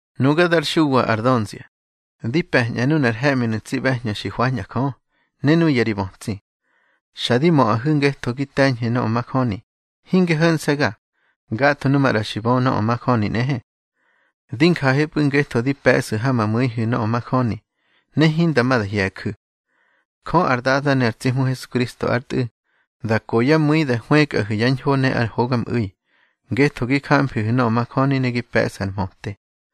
Nuga dar Xuwa ar dönzia, di pe̱ñꞌa nunar he̱ꞌminu̱ tsi ꞌbe̱hñö xi hwañꞌa Jö, ne nuya ri bötsi. Xa di möꞌahu̱ ngetho gi te̱ñhu̱ nöꞌö majöni, hinge ho̱nse̱ga, gatho nu maꞌra xi bö nöꞌö majöni nꞌehe. Di njahepꞌu̱ ngetho di pe̱ꞌsu̱ ha ma mu̱ihu̱ nöꞌö majöni, ne hinda ma da hye̱ju̱. Jö ar Dada ne ar tsi Hmu Hesukristo ár Tꞌu̱, da ko yá mu̱i da hwëkꞌahu̱ yá ñho ne ar hogamꞌu̱i, ngetho gi jamfihu̱ nöꞌö majöni ne gi pe̱ꞌsu̱ ar mhöte.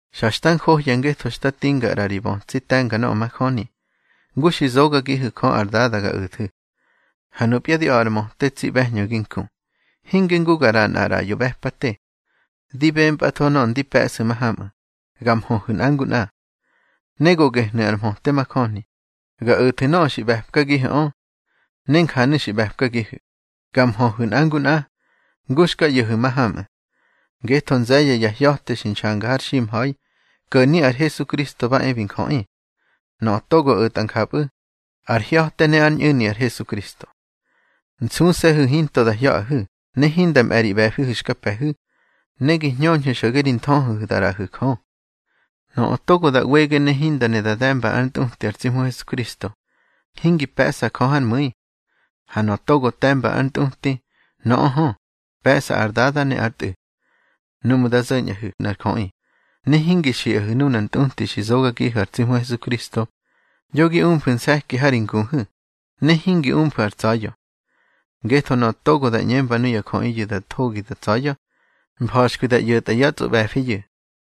Xa xta njohya ngetho xta tinga ꞌra ri bötsi te̱nga nöꞌö majöni, ngu xi zogagihu̱ Jö ar Dada ga o̱thu̱. Ha nupya di a̱ꞌa ar möte, tsi ꞌbe̱hñö gi nku. Hinge ngu ga ꞌraꞌa nꞌar ꞌraꞌyo ꞌbe̱pate. Di bempꞌatho nöꞌö ndi pe̱ꞌsu̱ mahamꞌu̱, ga nmhöhu̱ nꞌa ngu nꞌa. Ne go gehnu̱ ar mhöte majöni, ga o̱thu̱ nöꞌö xi ꞌbe̱pkagihu̱ꞌö. Ne njanu̱ xi ꞌbe̱pkagihu̱, ga nmhöhu̱ nꞌa ngu nꞌa, ngu xka ꞌyo̱hu̱ mahamꞌu̱. Ngetho nze̱ye̱ ya hya̱te xi nxanga har ximha̱i, ko̱ni ar Hesukristo ba e bi njöꞌi. Nöꞌö togo o̱tꞌa njapꞌu̱, ar hya̱te ne ár ñꞌu̱ni ar Hesukristo. Nsuse̱hu̱ hinto da hya̱ꞌahu̱ ne hinda mꞌe̱ ri ꞌbe̱fihu̱ xka pe̱hu̱, ne gi hñöñhu̱ xo̱ge ri nthöhöhu̱ da ꞌraꞌahu̱ Jö. Nöꞌö togo da ꞌwege ne hinda ne da de̱mba ár ntꞌuti ar tsi Hmu Hesukristo, hingi pe̱ꞌsa Jö hár mu̱i. Ha nöꞌö togo te̱mba ár ntꞌuti, nöꞌö hö, pe̱ꞌsa ar Dada ne ár Tꞌu̱. Nuꞌmu̱ da zo̱ñꞌahu̱ nꞌar jöꞌi, ne hingi xiꞌahu̱ nunar ntꞌuti xi zogagihu̱ ar tsi Hmu Hesukristo, yo gi umfu̱ nse̱ki ha ri nguhu̱, ne hingi umfu̱ ar tsa̱ya̱. Ngetho nöꞌö togo da ꞌñemba nuya jöꞌiyu̱ da thogi da tsa̱ya̱, mfa̱xkwi da ꞌyo̱tꞌa yá tsꞌoꞌbe̱fiyu̱.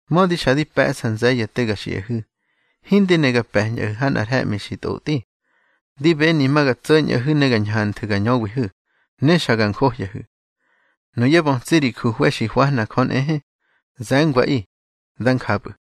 Mödi xa di pe̱ꞌsa nze̱ye̱ te ga xiꞌahu̱, hindi ne ga pe̱ñꞌahu̱ ha nꞌar he̱ꞌmi xi tꞌotꞌi. Di beni ma ga tso̱ñꞌahu̱ ne ga ñhanthu̱ ga ñöwihu̱, ne xa ga njohyahu̱. Nuyá bötsi ri juhwe̱ xi hwahna Jö nꞌehe, ze̱ngwaꞌi. Dá njapꞌu̱.